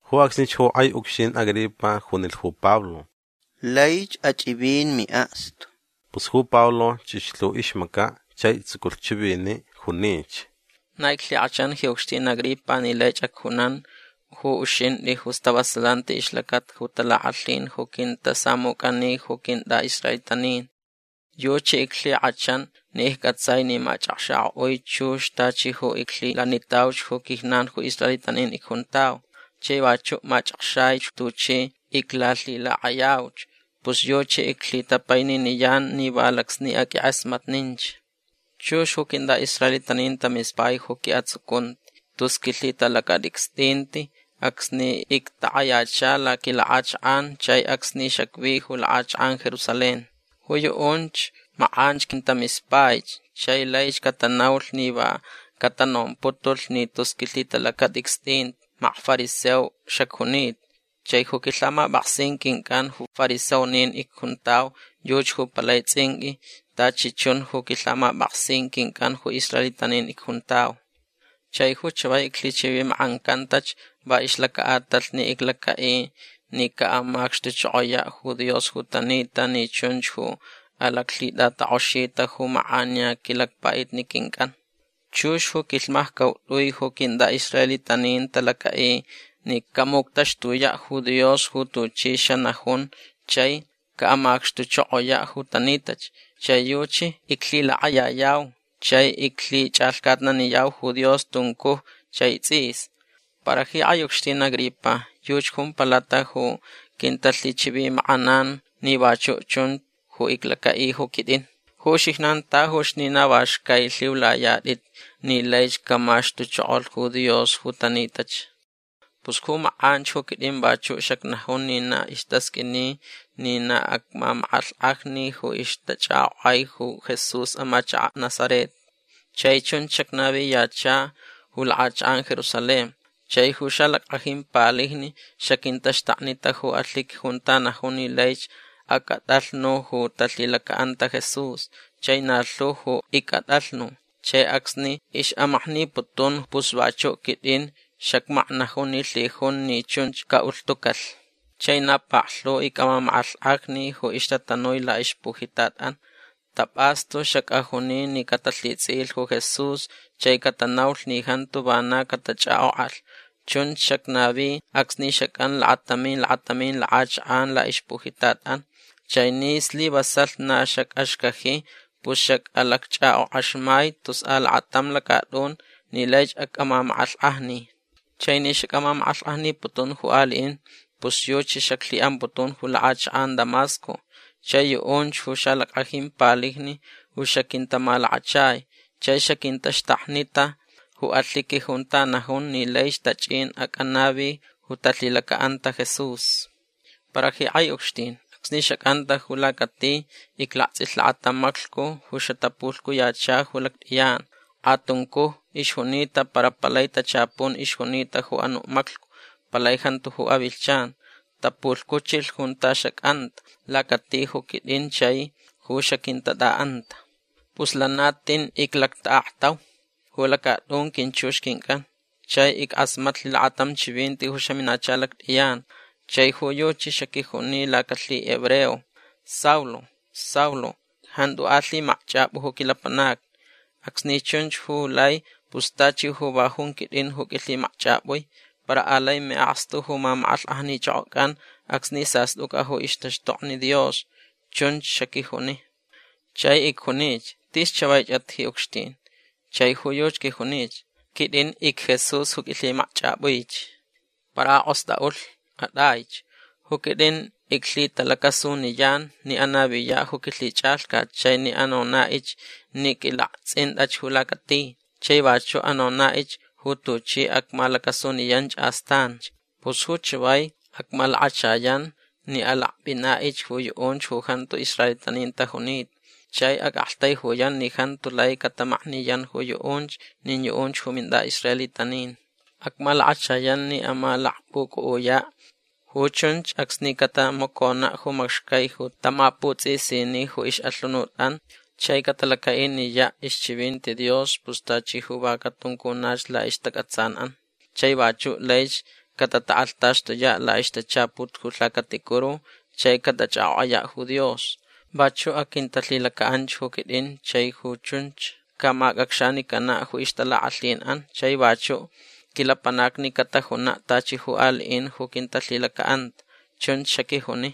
Ju acsnich ju kʼai ucxtin Agripa junilh ju Pablo: ―Laich achʼivin miʼakstu. Pus ju Pablo chʼixlh ju ixmacaʼ chai tsuculh chiviniʼ. Junich: ―Na iclhikʼachan ji ucxtin Agripa ni laich acjunan ju uxintʼi ju stavasalanti ixlacata ju talakʼalhin ju quintasamucʼani ju quintʼaʼisraelitanin. Yuchi iclhikʼachan ni iccʼatsai ni machʼakxakʼoʼui chux tachi ju iclhilanitauch ju quijnan ju israelitanin icjuntau. Chai vachuʼ machʼakxaich tuchi iclalhilakʼayauch. Pus yuchi iclhitapaininiyan ni va lacsni aqʼuinkʼasmatninch. Chux ju quintʼaʼisraelitanin tamispai ju quiʼatsucunti tus quilhitalacatʼicstʼinti acsni ictakʼayacha laquilakʼachakʼan chai acsni xacvi ju lakʼachakʼan Jerusalén. Ju yuʼunch makʼanch quintamispaich chai laich catanaulh ni va catanomputulh ni tus quilhitalacatʼicstʼinti makfariseo xacjunita. Chai ju quilhamapʼaksin quincʼan ju fariseonin icjuntau yuchi ju palai tsʼinqʼui tachi chun ju quilhamapʼaksin quincʼan ju israelitanin icjuntau. Chai ju chavai iclhichivimakʼancantach va ixlacaʼatalh ni iclacaʼi ni caʼamacxtuchokoyaʼ ju Dios ju tanita ni chunch ju alaclhitʼatakʼoxita ju makʼaniya quilacpaʼitni quincʼan. Chux ju quilhmaccautʼui ju quintʼaʼisraelitanin talacaʼi ni camuctaxtuyaʼ ju Dios ju tuchi xanajun chai caʼamacxtuchokoyaʼ ju tanitach. Chai yuchi iclhilakʼayayau chai iclhichʼalhcatnaniyau ju Dios tuncuj chai tsʼis. Para ji kʼai ucxtin Agripa yuchi jumpalat ju quintalhichivimakʼanan ni vachuʼ chun ju iclacaʼi ju quitʼin. Ju uxijnan tajuch ni na va xcaich lhiulayatʼit ni laich camaxtuchokolh ju Dios ju tanitach. Pus ju makʼanch ju quitʼin vachuʼ xacnajun ni na istasqʼuini ni na acmamakʼalhkʼajni ju ixtachʼakʼokʼai ju Jesús amachakaʼ Nazaret. Chai chunch xacnaviyacha ju lakʼachakʼan Jerusalén. Chai ju xalackʼajin palijni xaquintaxtaknita ju alhiqui junta najun ni laich acʼatʼalhnu ju talhilacaʼanta Jesús. Chai na lhu ju icʼatʼalhnu. Chai acsni ixʼamakniputun pus vachuʼ quitʼin xacmaknajun ni lhijun ni chunch caʼulhtucalh. Chai na paklhu icʼamamakʼalhkʼajni ju ixtatanui laʼixpujitatʼan. Tapʼastu xacʼajuni ni catalhitsʼiʼilh ju Jesús chai catanaulh ni jantu vana catachʼakʼokʼalh. Chunch xacnavi acsni xacʼan lakatamin lakatamin lakʼachakʼan laʼixpujitatʼan. Chai ni slivasalh na xacʼaxcaji pus xacʼalacchʼakʼokʼaxmai tus alakatam lacatʼun ni laich acʼamamakʼalhkʼajni. Chai ni xacʼamamakʼalhkʼajniputun ju aliʼin pus yuchi xaclhiʼamputun ju lakʼachakʼan Damasco. Chai yuʼunch ju xalackʼajin palijni ju xaquintamalakachai chai xaquintaxtaknita ju alhiqui junta najun ni laich tachʼin acʼanavi ju talhilacaʼanta Jesús. Para ji kʼai ucxtin acsni xacʼanta ju lacati iclaktsʼilh lakatam maclhcu ju xatapulhcuyacha ju lactʼiyan. Kʼatuncuj ixjunita para palai tachapun ixjunita ju anuʼ maclhcu. Palai jantu ju avilhchan. Tapulhcuchilh junta xacʼanta lacati ju quitʼin chai ju xaquintatʼaʼanta. Pus lana tin iclactaʼaktau ju lacatʼun quinchux quincʼan. Chai ickʼasmatlh lakatam chivinti ju xaminacha lactʼiyan. Chai ju yuchi xaquijuni laquilhihebreo: “Saulo. Saulo. Jantu alhimakchʼapʼu ju quilapanacni. Acsni chʼun ju lai pus tachi ju va jun quitʼin ju qʼuilhimakchʼapʼui. Para alai miʼakstu ju mamakʼalhkʼajnichʼokʼocʼan acsni sastʼucʼa ju ixtaxtokni Dios”. Chunch xaquijuni. Chai icjunich: “Tis chavaichʼat ji ucxtin”. Chai ju yuchi quijuni: “Quitʼin icJesús ju qʼuilhimakchʼapʼuich. Para akʼostʼaʼulh. Atʼaich. Ju quitʼin iclhitalacasuniyan ni anaviyaʼ ju quilhichʼalhcat chai ni anonaʼich ni qʼuilaktsʼintʼach ju lacati. Chai vachuʼ anonaʼich ju tuchi acmalacasuniyanch astanch. Pus ju chavai acmalakachayan ni alakpʼinaʼich ju yuʼunch ju jantu israelitanin tajunita. Chai acʼaktaijuyan ni jantu lai catamakniyan ju yuʼunch nin yuʼunch ju mintʼaʼisraelitanin. Acmalakachayan ni amalakpʼucʼuʼuyaʼ. Ju chunch acsni catamaconaʼ ju macxcai ju tamaputsʼisini ju ixʼalhunutʼan chai catalacaʼiniyaʼ ixchivinti Dios pus tachi ju va catuncunach laʼistacʼatsanʼan. Chai vachuʼ laich catatakʼalhtaxtuyaʼ laʼixtachaput ju lhacaticuru chai catachʼakʼokʼayaʼ ju Dios. Vachuʼ aquintalhilacaʼanch ju quitʼin chai ju chunch camacʼacxanicanaʼ ju ixtalakʼalhinʼan chai vachuʼ quilapanacni catajunaʼ tachi ju aliʼin ju quintalhilacaʼanta”. Chunch xaquijuni.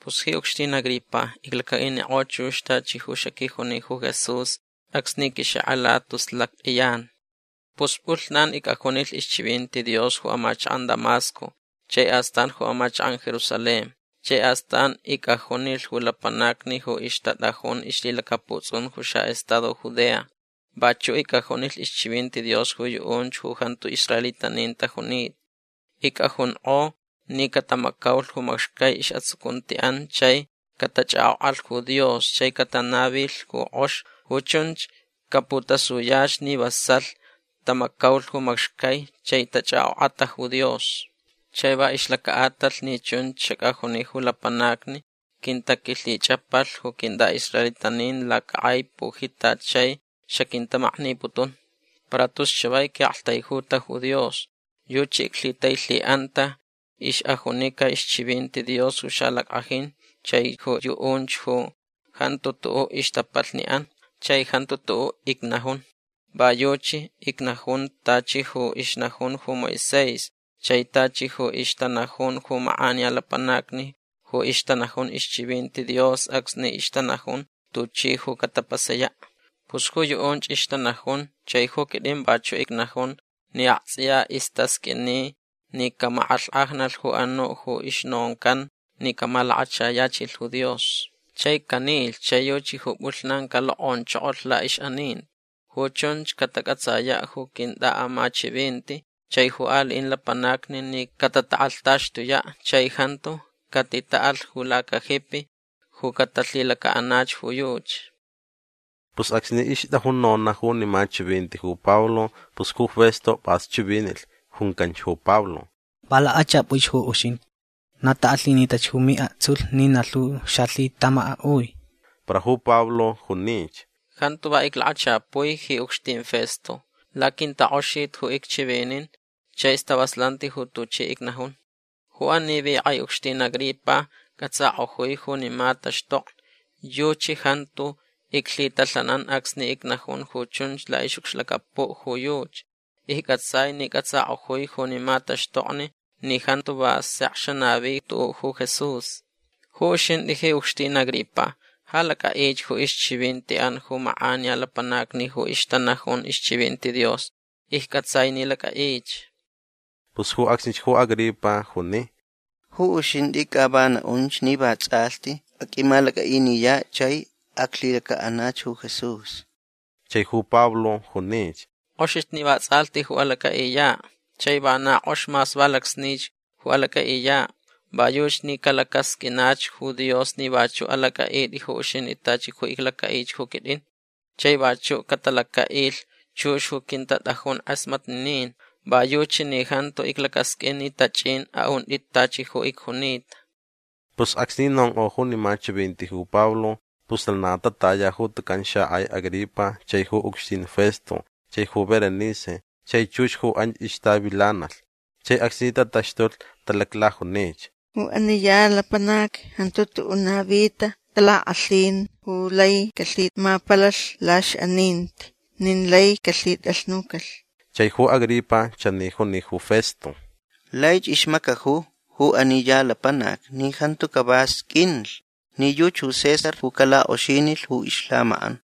Pus ji ucxtin Agripa iclacaʼinikʼo chux tachi ju quijuni ju Jesús acsni quixakʼalacha tus lactʼiyan. Pus pʼulhnan icʼajunilh ixchivinti Dios ju amachakʼan Damasco chai astan ju amachakʼan Jerusalén. Chai astan icʼajunilh ju lapanacni ju ixtatʼajun ixlhilacaputsʼun ju xaʼestado Judea. Vachuʼ icʼajunilh ixchivinti Dios ju yuʼunch ju jantu israelitanin tajunita. Icʼajunkʼo ni catamacaulh ju macxcai isʼatsucuntiʼan chai catachʼakʼokʼalh ju Dios chai catanavilh ju kʼox. Ju chunch caputasuyach ni vasalh tamacaulh ju macxcai chai tachʼakʼokʼata ju Dios. Chai va ixlacaʼatalh ni chunch xacʼajuni ju lapanacni quintaquilhichʼapalh ju quintʼaʼisraelitanin lacakʼai pujitat chai xaquintamakniputun. Para tus chavai quiʼaktaijuta ju Dios. Yuchi iclhitailhiʼanta ixʼajunica ixchivinti Dios ju xalackʼajin chai ju yuʼunch ju jantu tuʼuʼ ixtapalhniʼan. Chai jantu tuʼuʼ icnajun. Va yuchi icnajun tachi ju ixnajun ju Moisés chai tachi ju ixtanajun ju makʼaniya lapanacni ju ixtanajun ixchivinti Dios acsni ixtanajun tuchi ju catapasayaʼ. Pus ju yuʼunch ixtanajun chai ju quitʼin vachuʼ icnajun ni aktsʼiya istasqʼuini ni camakʼalhkʼajnalh ju anuʼ ju ixnoncan ni camalakachayachilh ju Dios. Chai canilh chai yuchi ju pʼulhnan calokʼonchokolh laʼixʼaninti. Ju chunch catacʼatsayaʼ ju quintʼaʼamachivinti chai ju aliʼin lapanacni ni catatakʼalhtaxtuyaʼ chai jantu catitaʼalh ju lacajipi ju catalhilacaʼanach ju yuchi. Pus acsni ixtʼajun nonaʼ junima chivinti ju Pablo pus ju Festo pʼas chivinilh. Juncanch ju Pablo: ―Va lakʼachʼapʼuich ju uxintʼi. Na takʼalhinitach ju miʼaktsulh ni na lhu xalhitʼamakʼaʼui. Para ju Pablo junich: ―Jantu va iclakachapui ji ucxtin Festo. Laquintakʼoxiti ju icchivinin chai stavasalanti ju tuchi icnajun. Ju ani vi kʼai ucxtin Agripa cʼatsakʼojui junima taxtokni. Yuchi jantu iclhitalhanan acsni icnajun ju chunch laʼixʼucxlacapuʼ ju yuchi. Iccʼatsai ni cʼatsakʼojui junima taxtokni ni jantu va sek xanavi tuʼuʼ ju Jesús. Ju uxintʼi ji ucxtin Agripa ja lacʼaʼich ju ixchivintiʼan ju makʼaniya lapanacni ju ixtanajun ixchivinti Dios. Iccʼatsai ni lacʼaʼich. Pus ju acsnich ju Agripa juni: ―Ju uxintʼi ca va naʼunch ni vatsʼalhti aqʼuimalacʼaʼiniyaʼ chai aclhilacaʼanach ju Jesús. Chai ju Pablo junich: ―Kʼoxich ni vatsʼalhti ju alacʼaʼiyaʼ. Chai vana kʼox mas va lacsnich ju alacʼaʼiyaʼ. Va yuchi ni calacasqʼuinach ju Dios ni vachuʼ alacʼaʼitʼi ju uxintʼi tachi ju iclacaʼich ju quitʼin. Chai vachuʼ catalacaʼilh chux ju quintatʼajun kʼasmatninin. Va yuchi ni jantu iclacasqʼuin ni tachʼin aʼuntʼit tachi ju icjunita. Pus acsni nonkʼo junima chivinti ju Pablo pus lana tataya ju tucan xakʼai Agripa chai ju ucxtin Festo chai ju Berenice chai chux ju anch ixtavilanalh. Chai acsni tataxtulh talaclajunich: ―Ju ani ya lapanac jantu tuʼuʼ navita talakʼalhin ju lai calhimapalalh laʼixʼaninti nin lai calhitʼalhnucalh. Chai ju Agripa chani juni ju Festo: ―Laich ixmacaju ju ani ya lapanac ni jantu cava sqʼuinlh ni yuchi ju César ju calakʼoxinilh ju ixlhamakʼan.